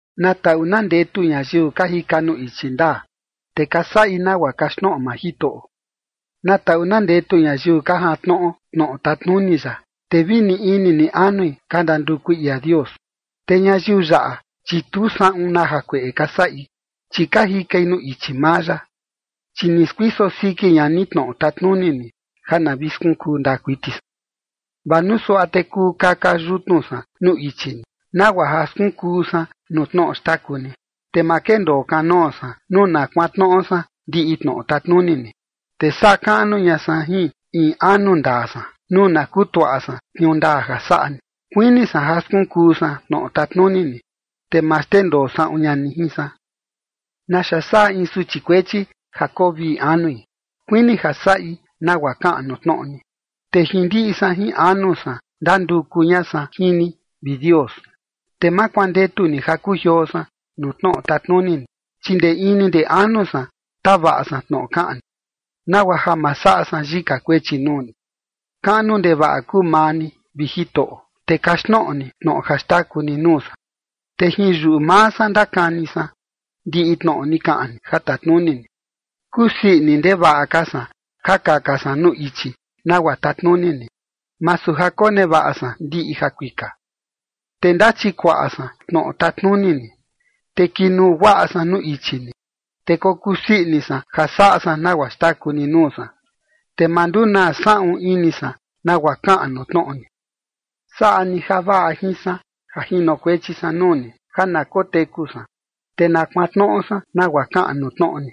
Na taꞌu na ndetu ñayiu ka jika nuu ichi ndaa, te ka saꞌi nagua kaxtnoꞌo maa Jitoꞌo. Na taꞌu na ndetu ñayiu ka jantnoꞌo tnoꞌo tatnuni ya, te vi ni ini ni anui ka ndandukui ia Dios. Te ñayiu yaꞌa, chi tu saꞌun na jakueꞌe ka saꞌi, chi ka jikai nuu ichi maa ya. Chi ni skuiso siki ña ni tnoꞌo tatnuni ni, ja na vi skunkuu ndaa kuiti san. Vaa nuu suaꞌa te kuu kaka yutnu san nuu ichi ni, nagua ja skunkuu san nuu tnoꞌo xtaku ni, te ma kendoo kanoo san, nuu na kuantnoꞌo san ndiꞌi tnoꞌo tatnuni ni. Te saꞌa kaꞌnu ña san jin in anu ndaa san, nuu na kutuaꞌa san tniuu ndaa ja saꞌa ni. Kuini san ja skunkuu san tnoꞌo tatnuni ni, te ma xndendoo saꞌun ña ni jin san. ¿Naxa saꞌa in suchi kuechi ja koo vii anui? Kuini ja saꞌi nagua kaꞌan nuu tnoꞌo ni. Te jin ndiꞌi san jin anu san ndanduku ña san jin ni, vi Dios, te ma kuandetu ni ja kujioo san nuu tnoꞌo tatnuni ni. Chi ndee ini ndee anu san tavaꞌa san tnoꞌo kaꞌan ni, nagua ja ma saꞌa san yika kuechi nuu ni. Kaꞌnu ndevaꞌa kuu maa ni, vi Jitoꞌo, te kaxtnoꞌo ni tnoꞌo ja xtaku ni nuu san. Te jin yuꞌu maa san ndakani san, ndiꞌi tnoꞌo ni kaꞌan ni ja tatnuni ni. Kusii ini ndevaꞌa ka san ja kaka san nuu ichi nagua tatnuni ni, masu ja konevaꞌa san ndiꞌi jakuika. Te ndachikuaꞌa san tnoꞌo tatnuni ni, te kinuu guaꞌa san nuu ichi ni. Te kokuu sii ini san ja saꞌa san nagua xtaku ni nuu san, te ma ndunaa saꞌun ini san nagua kaꞌan nuu tnoꞌo ni. Saꞌa ni javaꞌa jin san ja jinokuechi san nuu ni, ja na koteku san, te na kuantnoꞌo san nagua kaꞌan nuu tnoꞌo ni.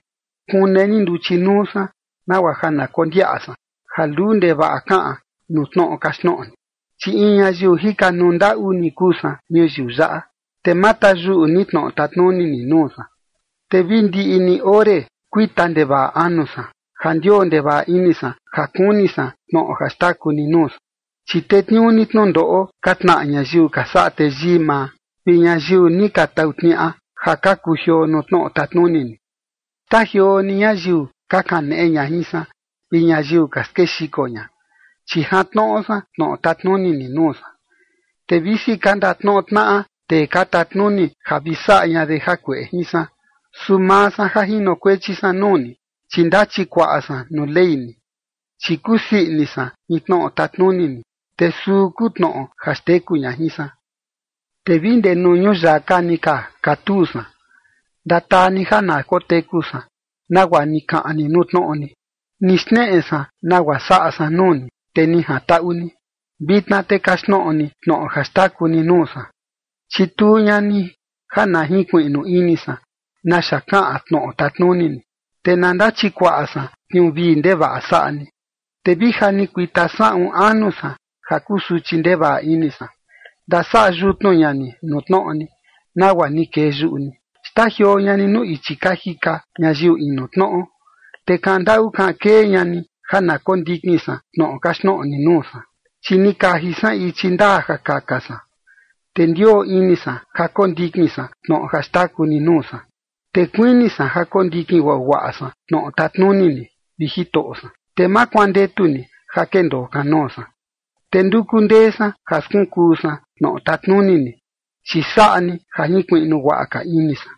Kune ni nduchi nuu san, nagua ja na kondiaꞌa san, ja luu ndevaꞌa kaꞌan nuu tnoꞌo kaxtnoꞌo ni. Chi in ñayiu jikanuu ndaꞌu ni kuu san ñuyiu yaꞌa, te ma tayuꞌu ni tnoꞌo tatnuni ni nuu san. Te vi ndiꞌi ni ore kuita ndevaꞌa anu san, ja ndioo ndevaꞌa ini san ja kuni san tnoꞌo ja xtaku ni nuu san. Chi tetniuu ni tnundoꞌo ka tnaꞌa ñayiu ka saꞌa teyii maa, vi ñayiu ni ka tau tniaꞌa, ja ka kujioo nuu tnoꞌo tatnuni ni. Xtajioo ni ñayiu ka kaneꞌe ña jin san, vi ñayiu ka skexiko ña, chi jantnoꞌo san tnoꞌo tatnuni ni nuu san. Te visi ka ndatnoꞌo tnaꞌa tee ka tatnuni ja vi saꞌa ña de jakueꞌe jin san, su maa san ja jinokuechi san nuu ni, chi ndachikuaꞌa san nuu ley ni. Chi kusii ini san jin tnoꞌo tatnuni ni, te suu kuu tnoꞌo ja xteku ña jin san. Te vi ndee nuu ñuyaka ni ka katuu san, ndataa ni ja na koteku san, nagua ni kaꞌan ni nuu tnoꞌo ni. Ni xneꞌe san nagua saꞌa san nuu ni, te ni jantaꞌu ni. Vitna te kaxtnoꞌo ni tnoꞌo ja xtaku ni nuu san. Chituu ña ni ja na jinkuiꞌnu ini san naxa kaꞌan tnoꞌo tatnuni ni, te na ndachikuaꞌa san tniuu vii ndevaꞌa saꞌa ni. Te vi ja ni kuita saꞌun anu san ja kusuchi ndevaꞌa ini san, ndasaꞌa yutnu ña ni nuu tnoꞌo ni, nagua ni kee yuꞌu ni. Xtajioo ña ni nuu ichi ka jika ñayiu inu tnoꞌo, te kaꞌan ndaꞌu kaꞌan kee ña ni ja na kondikin san tnoꞌo kaxtnoꞌo ni nuu san. Chi ni kaji san ichi ndaa ja kaka san, te ndioo ini san ja kondikin san tnoꞌo ja xtaku ni nuu san. Te kuini san ja kondikin guaguaꞌa san tnoꞌo tatnuni ni, vi Jitoꞌo san, te ma kuandetu ni ja kendoo kanoo san. Te nduku ndee san ja skunkuu san tnoꞌo tatnuni ni, chi saꞌa ni ja jinkuiꞌnu guaꞌa ka ini san.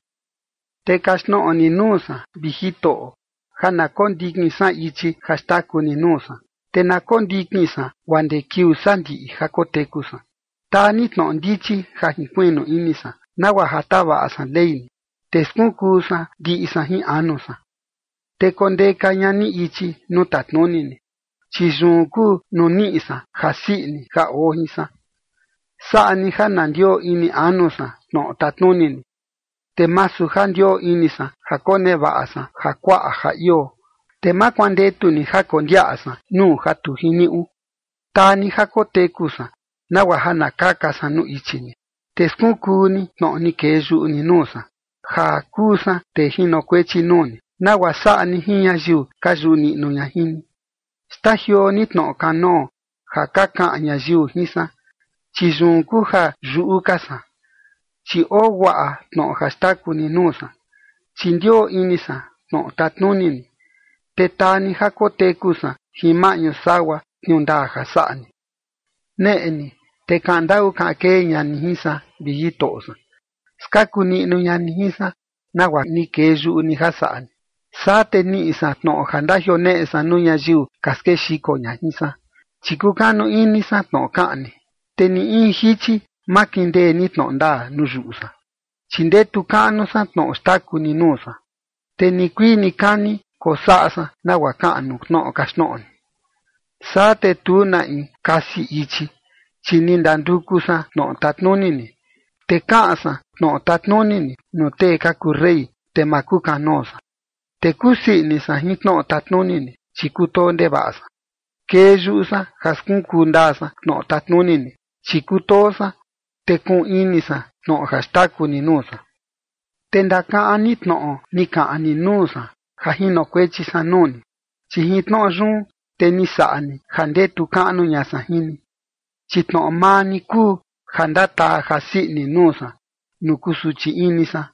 Te kaxtnoꞌo ni nuu san, vi Jitoꞌo, ja na kondikin san ichi ja xtaku ni nuu san, te na kondikin san guaa ndee kiuu sandiꞌi ja koteku san. Taa ni tnoꞌo ndichi ja jinkuiꞌnu ini san, nagua ja tavaꞌa san ley ni, te skunkuu san ndiꞌi san jin anu san. Te kondeka ña ni ichi nuu tatnuni ni, chi yun kuu nuu niꞌi san jasii ini ja oo jin san. Saꞌa ni ja na ndioo ini anu san tnoꞌo tatnuni ni, te masu ja ndioo ini san ja konevaꞌa san ja kuaꞌa ja ioo. Te ma kuandetu ni ja kondiaꞌa san nuu ja tu jiniuꞌu. Taa ni ja koteku san, nagua ja na kaka san nuu ichi ni. Te skunkuu ni tnoꞌo ni kee yuꞌu ni nuu san, ja kuu san tee jinokuechi nuu ni, nagua saꞌa ni jin ñayiu ka yuꞌu niꞌnu ña jin ni. Xtajioo ni tnoꞌo kanoo ja ka kaꞌan ñayiu jin san, chi yun kuu ja yuꞌu ka san, chi oo guaꞌa tnoꞌo ja xtaku ni nuu san. Chi ndioo ini san tnoꞌo tatnuni ni, te taa ni ja koteku san jin maꞌñu sagua tniuu ndaa ja saꞌa ni. Neꞌe ni, te kaꞌan ndaꞌu kaꞌan kee ña ni jin san, vi Jitoꞌo san. Skaku niꞌnu ña ni jin san, nagua ni kee yuꞌu ni ja saꞌa ni. Saa te niꞌi san tnoꞌo ja ndajioneꞌe san nuu ñayiu ka skexiko ña jin san, chi kukanu ini san tnoꞌo kaꞌan ni. Te ni in jichi ma kindee ni tnoꞌo ndaa nuu yuꞌu san, chi ndetu kaꞌnu san tnoꞌo xtaku ni nuu san. Te nikuii nikani kosaꞌa san nagua kaꞌan nuu tnoꞌo kaxtnoꞌo ni. Saa te tu na in kasi ichi, chi ni ndanduku san tnoꞌo tatnuni ni. Te kaꞌan san tnoꞌo tatnuni ni nuu tee ka kuu rey, te ma kukanoo san. Te kusii ini san jin tnoꞌo tatnuni ni, chi kutoo ndevaꞌa san. Kee yuꞌu san ja skunkuu ndaa san tnoꞌo tatnuni ni, chi kutoo san, te kuꞌun ini san tnoꞌo ja xtaku ni nuu san. Te ndakaꞌan ni tnoꞌo ni kaꞌan ni nuu san, ja jinokuechi san nuu ni, chi jin tnoꞌo yun, te ni saꞌa ni ja ndetu kaꞌnu ña san jin ni. Chi tnoꞌo maa ni kuu ja ndataa jasii ini nuu san nuu kusuchi ini san.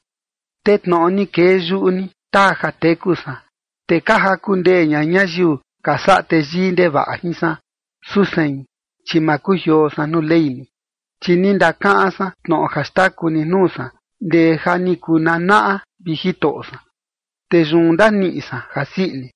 Te tnoꞌo ni kee yuꞌu ni, taa ja teku san. Te ka jaku ndee ña ñayiu ka saꞌa teyii ndevaꞌa jin san, su sein, chi ma kujioo san nuu ley ni. Chi ni ndakaꞌan san tnoꞌo ja xtaku ni nuu san, ndee ja ni kuu nanaꞌa, vi Jitoꞌo san, te yun ndaniꞌi san jasii ini.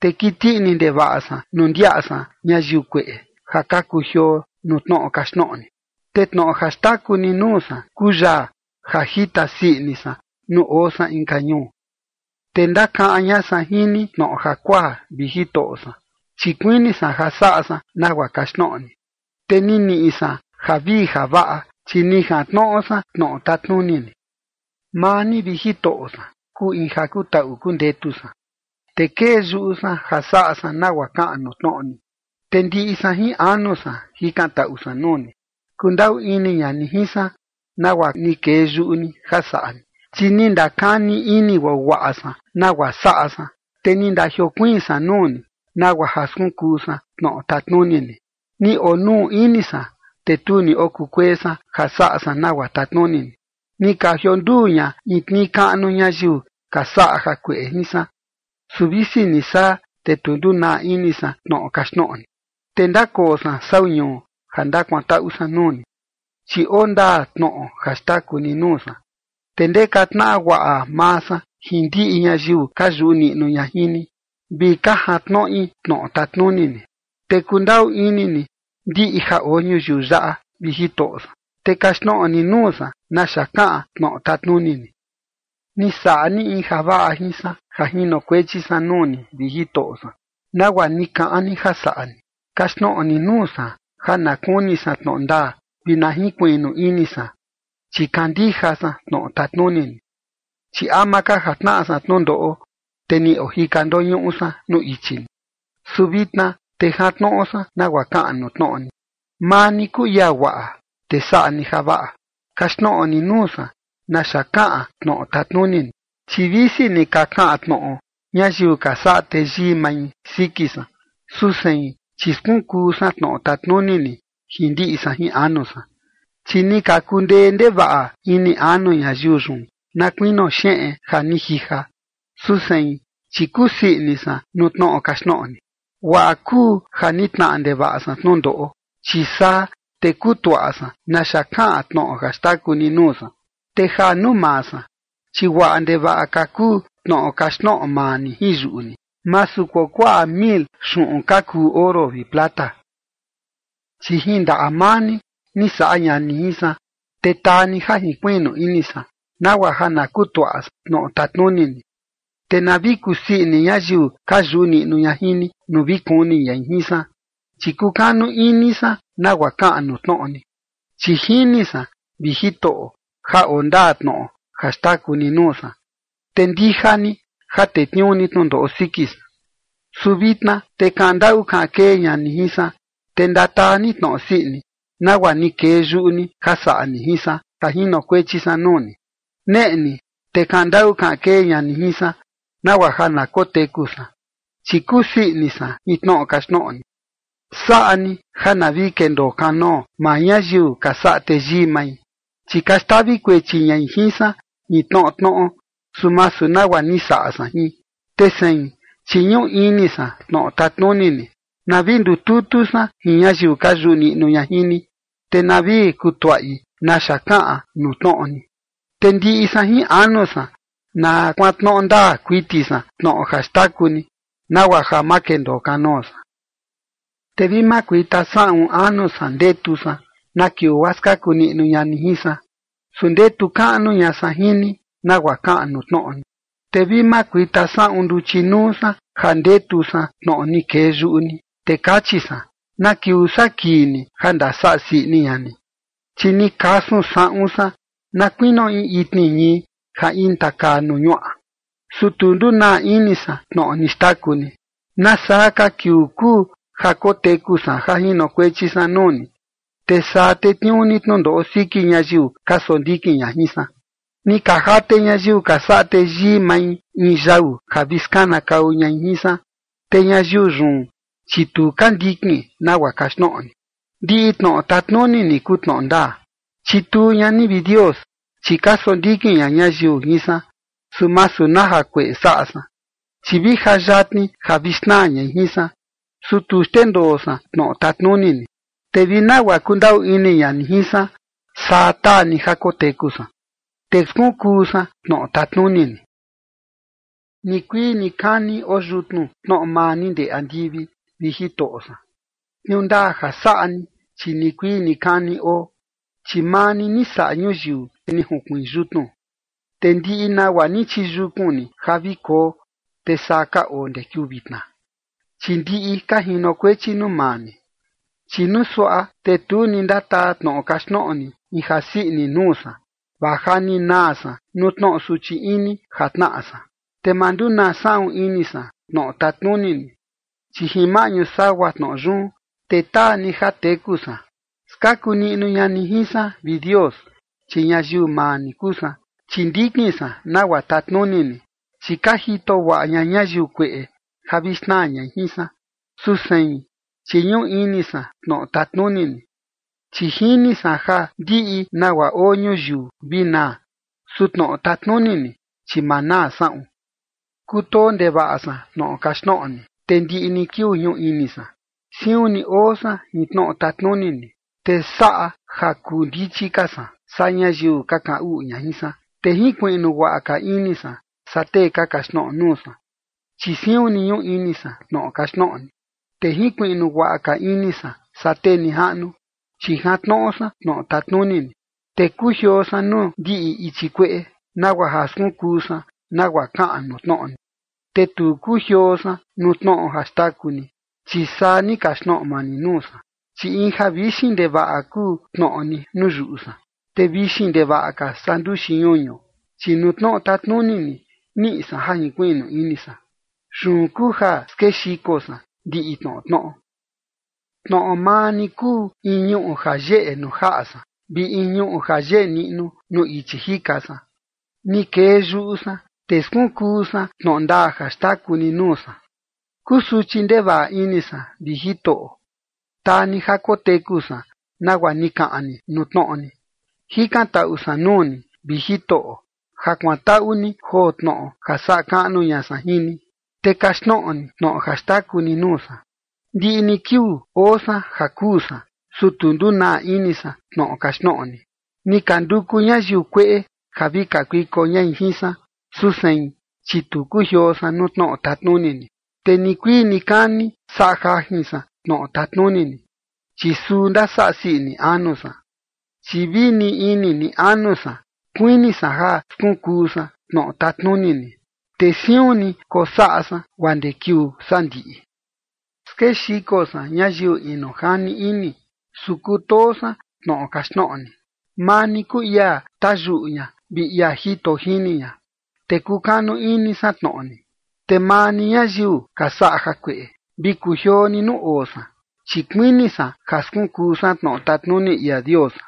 Te kiti ini ndevaꞌa san nuu ndiaꞌa san ñayiu kueꞌe, ja ka kujioo nuu tnoꞌo kaxtnoꞌo ni. Te tnoꞌo ja xtaku ni nuu san kuu yaa ja jita sii ini san nuu oo san inka ñuu. Te ndakaꞌan ña san jin ni tnoꞌo jakuaa, vi Jitoꞌo san, chi kuini san ja saꞌa san nagua kaxtnoꞌo ni. Te ni niꞌi san javii javaꞌa, chi ni jantnoꞌo san tnoꞌo tatnuni ni. Maa ni, vi Jitoꞌo san, kuu in ja kutaꞌu kundetu san, Te kee yuꞌu san ja saꞌa san nagua kaꞌan nuu tnoꞌo ni. Te ndiꞌi san jin anu san jikantaꞌu san nuu ni. Kundaꞌu ini ña ni jin san, nagua ni kee yuꞌu ni ja saꞌa ni. Chi ni ndakani ini guaguaꞌa san nagua saꞌa san, te ni ndajiokuiin san nuu ni, nagua ja skunkuu san tnoꞌo tatnuni ni. Ni onuu ini san, te tu ni okukuee san, ja saꞌa san nagua tatnuni ni. Ni ka jionduu ña in tnii kaꞌnu ñayiu ka saꞌa jakueꞌe jin san, su visi ni saa, te tu ndunaa ini san tnoꞌo kaxtnoꞌo ni. Te ndakoo san sau ñuu ja ndakuantaꞌu san nuu ni, chi oo ndaa tnoꞌo ja xtaku ni nuu san. Te ka ndeka tnaꞌa guaꞌa maa san jin ndiꞌi ñayiu ka yuꞌu niꞌnu ña jin ni, vi ka jantnoꞌi tnoꞌo tatnuni ni. Te kundaꞌu ini ni ndiꞌi ja oo ñuyiu yaꞌa, vi Jitoꞌo san. Te kaxtnoꞌo ni nuu san naxa kaꞌan tnoꞌo tatnuni ni. Ni saꞌa ni in javaꞌa jin san ja jinokuechi san nuu ni, vi Jitoꞌo san, nagua ni kaꞌan ni ja saꞌa ni. Kaxtnoꞌo ni nuu san, ja na kuni san tnoꞌo ndaa, vi na jinkuiꞌnu ini san, chi kandija san tnoꞌo tatnuni ni. Chi ama ka ja tnaꞌa san tnundoꞌo, te ni ojika ndoñuꞌu san nuu ichi ni, su vitna, te jantnoꞌo san nagua kaꞌan nuu tnoꞌo ni. Maa ni kuu ia guaꞌa, te saꞌa ni javaꞌa. Kaxtnoꞌo ni nuu san naxa kaꞌan tnoꞌo tatnuni ni. Chi visi ni ka kaꞌan tnoꞌo ñayiu ka saꞌa teyii mai siki san, su sein, chi skunkuu san tnoꞌo tatnuni ni jin ndiꞌi san jin anu san. Chi ni ka kundee ndevaꞌa ini anu ñayiu yun, na kuinio xeꞌen ja ni jija, su sein, chi kusii ini san nuu tnoꞌo kaxtnoꞌo ni. Guaꞌa kuu ja ni tnaꞌa ndevaꞌa san tnundoꞌo, chi saa te kutuaꞌa san naxa kaꞌan tnoꞌo ja xtaku ni nuu san. Te ja nuu maa san, chi guaꞌa ndevaꞌa ka kuu tnoꞌo kaxtnoꞌo maa ni jin yuꞌu ni, masu kuakuaꞌa mil xuꞌun ka kuu oro vi plata. Chi jin ndaꞌa maa ni, ni saꞌa ña ni jin san, te taa ni ja jinkuiꞌnu ini san, nagua ja na kutuaꞌa san tnoꞌo tatnuni ni. Te na vi kusii ini ñayiu ka yuꞌu niꞌnu ña jin ni, nuu vi kuni ñai jin san, chi kukanu ini san nagua kaꞌan nuu tnoꞌo ni. Chi jini san, vi Jitoꞌo, ja oo ndaa tnoꞌo ja xtaku ni nuu san, te ndija ni ja tetniuu ni tnundoꞌo siki san. Su vitna, te kaꞌan ndaꞌu kaꞌan kee ña ni jin san, te ndataa ni tnoꞌo sii ini, nagua ni kee yuꞌu ni ja saꞌa ni jin san, ja jinokuechi san nuu ni. Neꞌe ni, te kaꞌan ndaꞌu kaꞌan kee ña ni jin san, nagua ja na koteku san, chi kusii ini san jin tnoꞌo kaxtnoꞌo ni. Saꞌa ni ja na vi kendoo kanoo maa ñayiu ka saꞌa teyii mai, chi ka xtavi kuechi ñai jin san jin tnoꞌo tnoꞌo, su masu nagua ni saꞌa san jin, te sein, chi ñuꞌu ini san tnoꞌo tatnuni ni. Na vi ndututu san jin ñayiu ka yuꞌu niꞌnu ña jin ni, te na vi kutuaꞌi naxa kaꞌan nuu tnoꞌo ni. Te ndiꞌi san jin anu san na kuantnoꞌo ndaa kuiti san tnoꞌo ja xtaku ni, nagua ja ma kendoo kanoo san. Te vi makuita saꞌun anu san ndetu san, na kiuu guaa skaku niꞌnu ña ni jin san, su ndetu kaꞌnu ña san jin ni nagua kaꞌan nuu tnoꞌo ni. Te vi makuita saꞌun nduchi nuu san ja ndetu san tnoꞌo ni kee yuꞌu ni, te kachi san: “¿Na kiuu saa kii ni ja ndasaꞌa sii ini ña ni?” Chi ni kasun saꞌun san na kuinio in itni ñii ja intakaa nuu ñuaꞌa, su tu ndunaa ini san tnoꞌo ni xtaku ni. ¿Nasaa ka kiuu kuu ja koteku san, ja jinokuechi san nuu ni, te saa tetniuu ni tnundoꞌo siki ñayiu ka sondikin ña jin san? Ni ka jate ñayiu ka saꞌa teyii mai in yau ja vi skanakau ñai jin san. Te ñayiu yun, chi tu ka ndikin nagua kaxtnoꞌo ni. Ndiꞌi tnoꞌo tatnuni ni kuu tnoꞌo ndaa. Chituu ña ni, vi Dios, chi ka sondikin ña ñayiu jin san, su masu na jakueꞌe saꞌa san. Chi vi ja yatni ja vi xnaa ñai jin san, su tu xndendoo san tnoꞌo tatnuni ni. Te vi nagua kundaꞌu ini ña ni jin san, saa taa ni ja koteku san, te skunkuu san tnoꞌo tatnuni ni. Nikuii nikani oo yutnu tnoꞌo maa ni ndee andivi, vi Jitoꞌo san. Tniuu ndaa ja saꞌa ni, chi nikuii nikani oo, chi maa ni, ni saꞌa ñuyiu, te ni junkuiin yutnu. Te ndiꞌi nagua ni chiyukun ni ja vi koo, te saa ka oo ndee kiuu vitna, chi ndiꞌi ka jinokuechi nuu maa ni. Chi nuu suaꞌa, te tu ni ndataa tnoꞌo kaxtnoꞌo ni in jasii ini nuu san, vaa ja ni naa san nuu tnoꞌo suchi ini ja tnaꞌa san. Te ma ndunaa saꞌun ini san tnoꞌo tatnuni ni, chi jin maꞌñu sagua tnoꞌo yun, te taa ni ja teku san. Skaku niꞌnu ña ni jin san, vi Dios, chi ñayiu maa ni kuu san, chi ndikin san nagua tatnuni ni. Chi ka jito guaꞌa ña ñayiu kueꞌe ja vi xnaa ñai jin san, su sein, chi ñuꞌu ini san tnoꞌo tatnuni ni. Chi jini san ja ndiꞌi nagua oo ñuyiu vi naa, su tnoꞌo tatnuni ni, chi ma naa saꞌun. Kutoo ndevaꞌa san tnoꞌo kaxtnoꞌo ni, te ndiꞌi ni kiuu ñuꞌu ini san. Siun ni oo san jin tnoꞌo tatnuni ni, te saꞌa ja kuu ndichi ka san, saa ñayiu ka kaꞌan uꞌu ña jin san. Te jinkuiꞌnu guaꞌa ka ini san saa tee ka kaxtnoꞌo nuu san, chi siun ni ñuꞌu ini san tnoꞌo kaxtnoꞌo ni. Te jinkuiꞌnu guaꞌa ka ini san saa tee nijaꞌnu, chi jantnoꞌo san tnoꞌo tatnuni ni. Te kujioo san nuu ndiꞌi ichi kueꞌe, nagua ja skunkuu san nagua kaꞌan nuu tnoꞌo ni. Te tu ni kujioo san nuu tnoꞌo ja xtaku ni, chi saa ni kaxtnoꞌo maa ni nuu san. Chi in ja vixin ndevaꞌa kuu tnoꞌo ni nuu yuꞌu san, te vixin ndevaꞌa ka saa nduxi ñuñu. Chi nuu tnoꞌo tatnuni ni, niꞌi san ja jinkuiꞌnu ini san. Yun kuu ja skexiko san ndiꞌi tnoꞌo tnoꞌo. Tnoꞌo maa ni kuu in ñuꞌu ja yeꞌe nuu jaꞌa san, vi in ñuꞌu ja yeꞌe niꞌnu nuu ichi jika san. Ni kee yuꞌu san, te skunkuu san tnoꞌo ndaa ja xtaku ni nuu san. Kusuchi ndevaꞌa ini san, vi Jitoꞌo. Taa ni ja koteku san nagua ni kaꞌan ni nuu tnoꞌo ni. Jikantaꞌu san nuu ni, vi Jitoꞌo, ja kuantaꞌu ni joo tnoꞌo ja saꞌa kaꞌnu ña san jin ni, te kaxtnoꞌo ni tnoꞌo ja xtaku ni nuu san. Ndiꞌi ni kiuu oo san ja kuu san, su tu ndunaa ini san tnoꞌo kaxtnoꞌo ni. Ni ka nduku ñayiu kueꞌe ja vi kakuiko ñai jin san, su sein, chi tu kujioo san nuu tnoꞌo tatnuni ni. Te nikuii nikani saꞌa jajin san tnoꞌo tatnuni ni, chi suu ndasaꞌa sii ini anu san. Chi vi ni ini ni anu san kuini san ja skunkuu san tnoꞌo tatnuni ni, te siun ni kosaꞌa san guaa ndee kiuu sandiꞌi. Skexiko san ñayiu inu jani ini, su kutoo san tnoꞌo kaxtnoꞌo ni. Maa ni kuu ia tayuꞌu ña vi ia jito jini ña, te kukanu ini san tnoꞌo ni. Te maa ni ñayiu ka saꞌa jakueꞌe, vi kujioo ni nuu oo san, chi kuini san ja skunkuu san tnoꞌo tatnuni ia Dios san.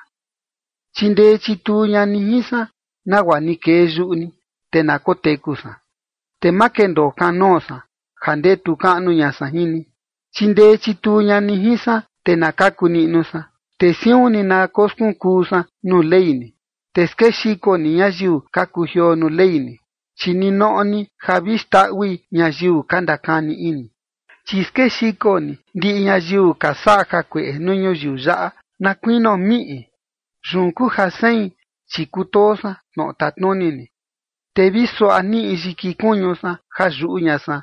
Chindee chituu ña ni jin san, nagua ni kee yuꞌu ni, te na koteku san, te ma kendoo kanoo san ja ndetu kaꞌnu ña san jin ni. Chindee chituu ña ni jin san, te na kaku niꞌnu san, te siun ni na koskunkuu san nuu ley ni. Te skexiko ni ñayiu ka kujioo nuu ley ni, chi ninoꞌo ni ja vi xndaꞌui ñayiu ka ndakani ini. Chi skexiko ni ndiꞌi ñayiu ka saꞌa jakueꞌe nuu ñuyiu yaꞌa, na kuinio miꞌi. Yun kuu ja sein, chi kutoo san tnoꞌo tatnuni ni. Te vi suaꞌa niꞌi yiki kuñu san ja yuꞌu ña san,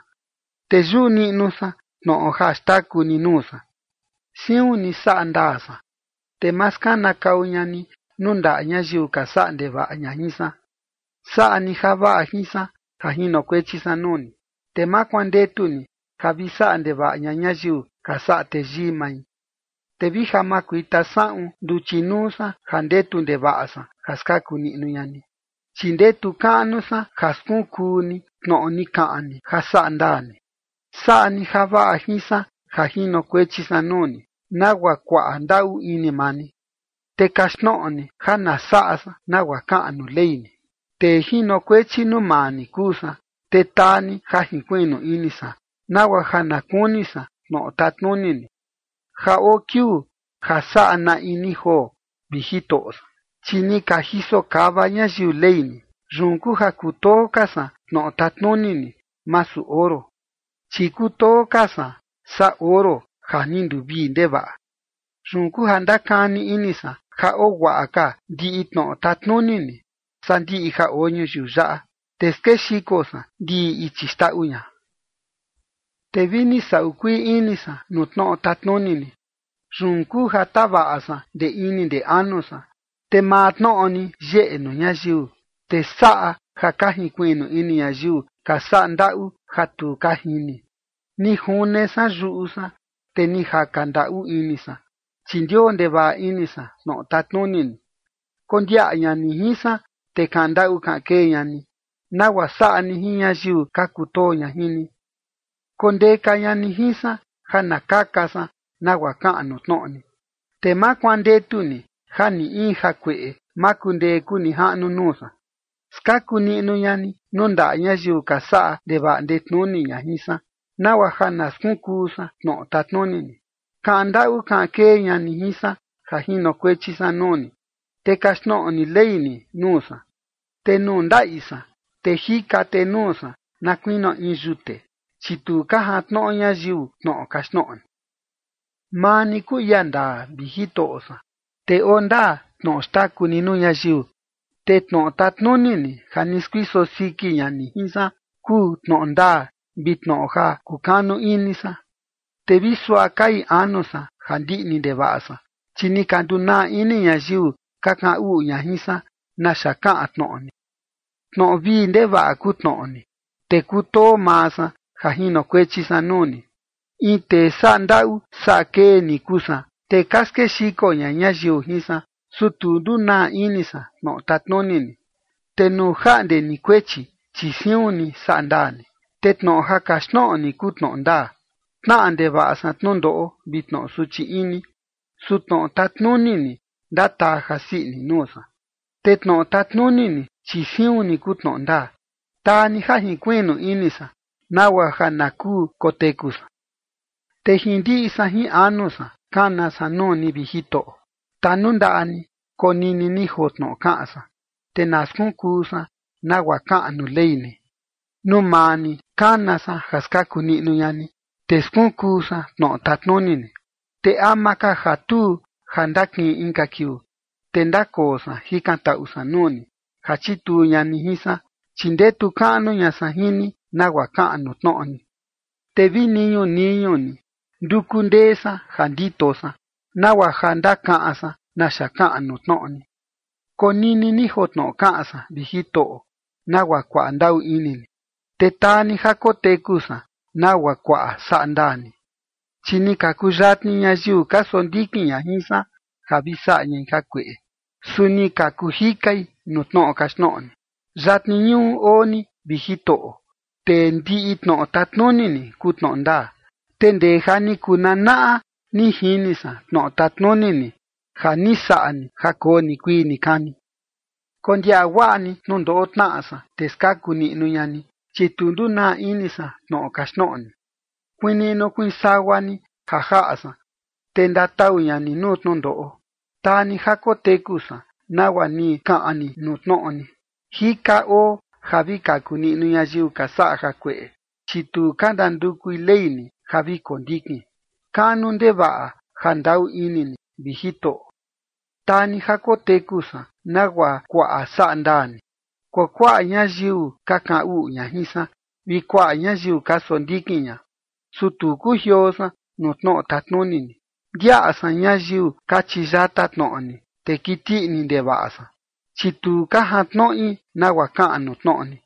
te yuꞌu niꞌnu san tnoꞌo ja xtaku ni nuu san. Siun ni saꞌa ndaa san, te ma skanakau ña ni nuu ndaꞌa ñayiu ka saꞌa ndevaꞌa ña jin san. Saꞌa ni javaꞌa jin san ja jinokuechi san nuu ni, te ma kuandetu ni ja vi saꞌa ndevaꞌa ña ñayiu ka saꞌa teyii mai. Te vi ja makuita saꞌun nduchi nuu san ja ndetu ndevaꞌa san ja skaku niꞌnu ña ni, chi ndetu kaꞌnu san ja skunkuu ni tnoꞌo ni kaꞌan ni ja saꞌa ndaa ni. Saꞌa ni javaꞌa jin san ja jinokuechi san nuu ni, nagua kuaꞌa ndaꞌu ini maa ni, te kaxtnoꞌo ni ja na saꞌa san nagua kaꞌan nuu ley ni. Tee jinokuechi nuu maa ni kuu san, te taa ni ja jinkuiꞌnu ini san, nagua ja na kuni san tnoꞌo tatnuni ni. Ja oo kiuu ja saꞌa na in ni joo, vi Jitoꞌo san, chi ni ka jiso kava ñayiu ley ni. Yun kuu ja kutoo ka san tnoꞌo tatnuni ni, masu oro, chi kutoo ka san saa oro ja ni nduvii ndevaꞌa. Yun kuu ja ndakani ini san ja oo guaꞌa ka ndiꞌi tnoꞌo tatnuni ni, saa ndiꞌi ja oo ñuyiu yaꞌa, te skexiko san ndiꞌi ichi xndaꞌu ña. Te vi ni saꞌu kuii ini san nuu tnoꞌo tatnuni ni, yun kuu ja tavaꞌa san ndee ini ndee anu san. Te maa tnoꞌo ni yeꞌe nuu ñayiu, te saꞌa ja ka jinkuiꞌnu ini ñayiu ka saꞌa ndaꞌu ja tu ka jini. Ni june san yuꞌu san, te ni jaka ndaꞌu ini san, chi ndioo ndevaꞌa ini san tnoꞌo tatnuni ni. Kondiaꞌa ña ni jin san, te kaꞌan ndaꞌu kaꞌan kee ña ni, nagua saꞌa ni jin ñayiu ka kutoo ña jin ni. Kondeka ña ni jin san ja na kaka san nagua kaꞌan nuu tnoꞌo ni, te ma kuandetu ni ja ni in jakueꞌe ma kundee kuu nijaꞌnu nuu san. Skaku niꞌnu ña ni nuu ndaꞌa ñayiu ka saꞌa ndevaꞌa ndetnuni ña jin san, nagua ja na skunkuu san tnoꞌo tatnuni ni. Kaꞌan ndaꞌu kaꞌan kee ña ni jin san ja jinokuechi san nuu ni, te kaxtnoꞌo ni ley ni nuu san. Te nuu ndaꞌi san, te jika tee nuu san na kuinio in yute, chi tu ka jantnoꞌo ñayiu tnoꞌo kaxtnoꞌo ni. Maa ni kuu ia ndaa, vi Jitoꞌo san, te oo ndaa tnoꞌo xtaku ni nuu ñayiu. Te tnoꞌo tatnuni ni, ja ni skuiso siki ña ni jin san, kuu tnoꞌo ndaa vi tnoꞌo ja kukanu ini san. Te vi suaꞌa kai anu san ja ndiꞌni ndevaꞌa san, chi ni ka ndunaa ini ñayiu ka kaꞌan uꞌu ña jin san naxa kaꞌan tnoꞌo ni. Tnoꞌo vii ndevaꞌa kuu tnoꞌo ni, te kutoo maa san ja jinokuechi san nuu ni. In tee saꞌa ndaꞌu saꞌa kee ni kuu san, te ka skexiko ña ñayiu jin san, su tu ndunaa ini san tnoꞌo tatnuni ni. Te nuu jaꞌnde ni kuechi, chi siun ni saꞌa ndaa ni, te tnoꞌo ja kaxtnoꞌo ni kuu tnoꞌo ndaa. Tnaꞌa ndevaꞌa san tnundoꞌo vi tnoꞌo suchi ini, su tnoꞌo tatnuni ni ndataa jasii ini nuu san. Te tnoꞌo tatnuni ni, chi siun ni kuu tnoꞌo ndaa. Taa ni ja jinkuiꞌnu ini san nagua ja na kuu koteku san. Te jin ndiꞌi san jin anu san kana san nuu ni, vi Jitoꞌo. Tanundaꞌa ni konini ni joo tnoꞌo kaꞌan san, te na skunkuu san nagua kaꞌan nuu Ley ni. Nuu maa ni kana san, ja skaku niꞌnu ña ni, te skunkuu san tnoꞌo tatnuni ni. Te ama ka ja tuu ja ndakiꞌin inka kiuu, te ndakoo san jikantaꞌu san nuu ni, ja chituu ña ni jin san, chi ndetu kaꞌnu ña san jin ni, nagua kaꞌan nuu tnoꞌo ni. Te vi niñuu niñuu ni nduku ndee san ja ndito san, nagua ja ndakaꞌan san naxa kaꞌan nuu tnoꞌo ni. Konini ni joo tnoꞌo kaꞌan san, vi Jitoꞌo, nagua kuaꞌa ndaꞌu ini ni, te taa ni ja koteku san nagua kuaꞌa saꞌa ndaa ni. Chi ni ka kuyatni ñayiu ka sondikin ña jin san ja vi saꞌa ñai jakueꞌe, su ni ka kuu jikai nuu tnoꞌo kaxtnoꞌo ni. Yatni ñuꞌu oo ni, vi Jitoꞌo, te ndiꞌi tnoꞌo tatnuni ni kuu tnoꞌo ndaa. Te ndee ja ni kuu nanaꞌa, ni jini san tnoꞌo tatnuni ni, ja ni saꞌa ni ja koo nikuii nikani. Kondiaꞌa guaꞌa ni tnundoꞌo tnaꞌa san, te skaku niꞌnu ña ni, chi tu ndunaa ini san tnoꞌo kaxtnoꞌo ni. Kuiin niꞌnu kuiin sagua ni ja jaꞌa san, te ndatau ña ni nuu tnundoꞌo. Taa ni ja koteku san nagua ni kaꞌan ni nuu tnoꞌo ni. Jika oo ja vi kaku niꞌnu ñayiu ka saꞌa jakueꞌe, chi tu ka ndandukui ley ni ja vi kondikin. Kaꞌnu ndevaꞌa ja ndaꞌu ini ni, vi Jitoꞌo. Taa ni ja koteku san nagua kuaꞌa saꞌa ndaa ni. Kuakuaꞌa ñayiu ka kaꞌan uꞌu ña jin san, vi kuaꞌa ñayiu ka sondikin ña, su tu kujioo san nuu tnoꞌo tatnuni ni. Ndiaꞌa san ñayiu kachi yata tnoꞌo ni, te kiti ini ndevaꞌa san, chi tu ka jantnoꞌi nagua kaꞌan nuu tnoꞌo ni.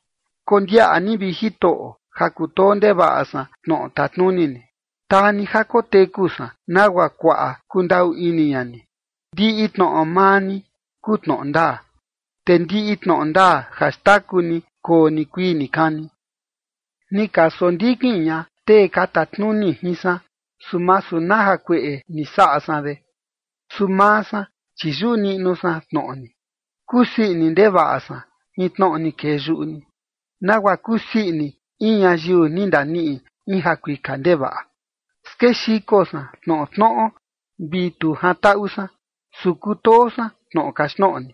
Kondiaꞌa ni, vi Jitoꞌo, ja kutoo ndevaꞌa san tnoꞌo tatnuni ni. Taa ni ja koteku san nagua kuaꞌa kundaꞌu ini ña ni. Ndiꞌi tnoꞌo maa ni kuu tnoꞌo ndaa, te ndiꞌi tnoꞌo ndaa ja xndaku ni koo nikuii nikani. Ni ka sondikin ña tee ka tatnuni jin san, su masu na jakueꞌe ni saꞌa san de. Su maa san, chi yuꞌu niꞌnu san tnoꞌo ni. Kusii ini ndevaꞌa san jin tnoꞌo ni kee yuꞌu ni, nagua kusii ini in ñayiu ni ndaniꞌi in jakuika ndevaꞌa. Skexiko san tnoꞌo tnoꞌo vi tu jantaꞌu san, su kutoo san tnoꞌo kaxtnoꞌo ni.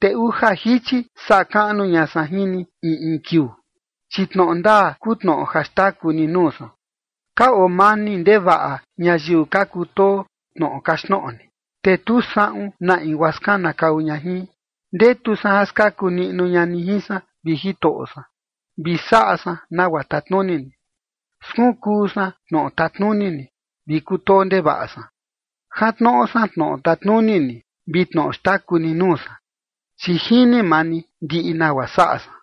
Te uja jichi saꞌa kaꞌnu ña san jin ni in in kiuu, chi tnoꞌo ndaa kuu tnoꞌo ja xndaku ni nuu san. Ka oo mani ndevaꞌa ñayiu ka kutoo tnoꞌo kaxtnoꞌo ni, te tu saꞌun na in guaa skanakau ña jin. Ndetu san ja skaku niꞌnu ña ni jin san, vi Jitoꞌo san, vi saꞌa san nagua tatnuni ni. Skunkuu san tnoꞌo tatnuni ni, vi kutoo ndevaꞌa san. Jantnoꞌo san tnoꞌo tatnuni ni vi tnoꞌo xtaku ni nuu san, chi jini maa ni ndiꞌi nagua saꞌa san.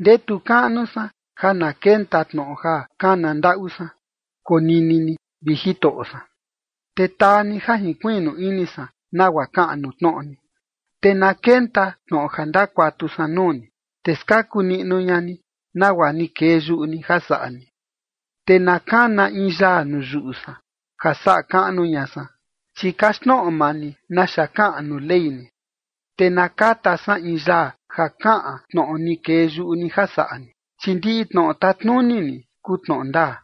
Ndetu kaꞌnu san ja na kenta tnoꞌo ja kana ndaꞌu san. Konini ni, vi Jitoꞌo san, te taa ni ja jinkuiꞌnu ini san nagua kaꞌan nuu tnoꞌo ni. Te na kenta tnoꞌo ja ndakuatu san nuu ni, te skaku niꞌnu ña ni, nagua ni kee yuꞌu ni ja saꞌa ni. Te na kana in yaa nuu yuꞌu san ja saꞌa kaꞌnu ña san, chi kaxtnoꞌo maa ni naxa kaꞌan nuu ley ni. Te na kata san in yaa ja kaꞌan tnoꞌo ni kee yuꞌu ni ja saꞌa ni, chi ndiꞌi tnoꞌo tatnuni ni kuu tnoꞌo ndaa.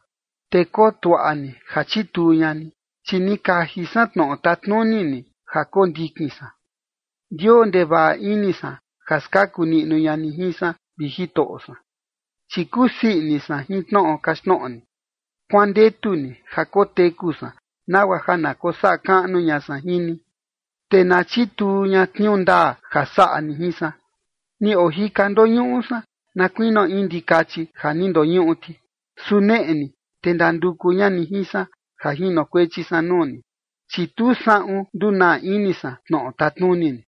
Te kotuaꞌa ni ja chituu ña ni, chi ni kaji san tnoꞌo tatnuni ni ja kondikin san. Ndioo ndevaꞌa ini san ja skaku niꞌnu ña ni jin san, vi Jitoꞌo san, chi kusii ini san jin tnoꞌo kaxtnoꞌo ni. Kuandetu ni ja koteku san, nagua ja na kosaꞌa kaꞌnu ña san jin ni, te na chituu ña tniuu ndaa ja saꞌa ni jin san. Ni ojika ndoñuꞌu san, na kuinio in ndikachi ja ni ndoñuꞌu ti, su neꞌe ni, te ndanduku ña ni jin san ja jinokuechi san nuu ni, chi tu saꞌun ndunaa ini san tnoꞌo tatnuni ni.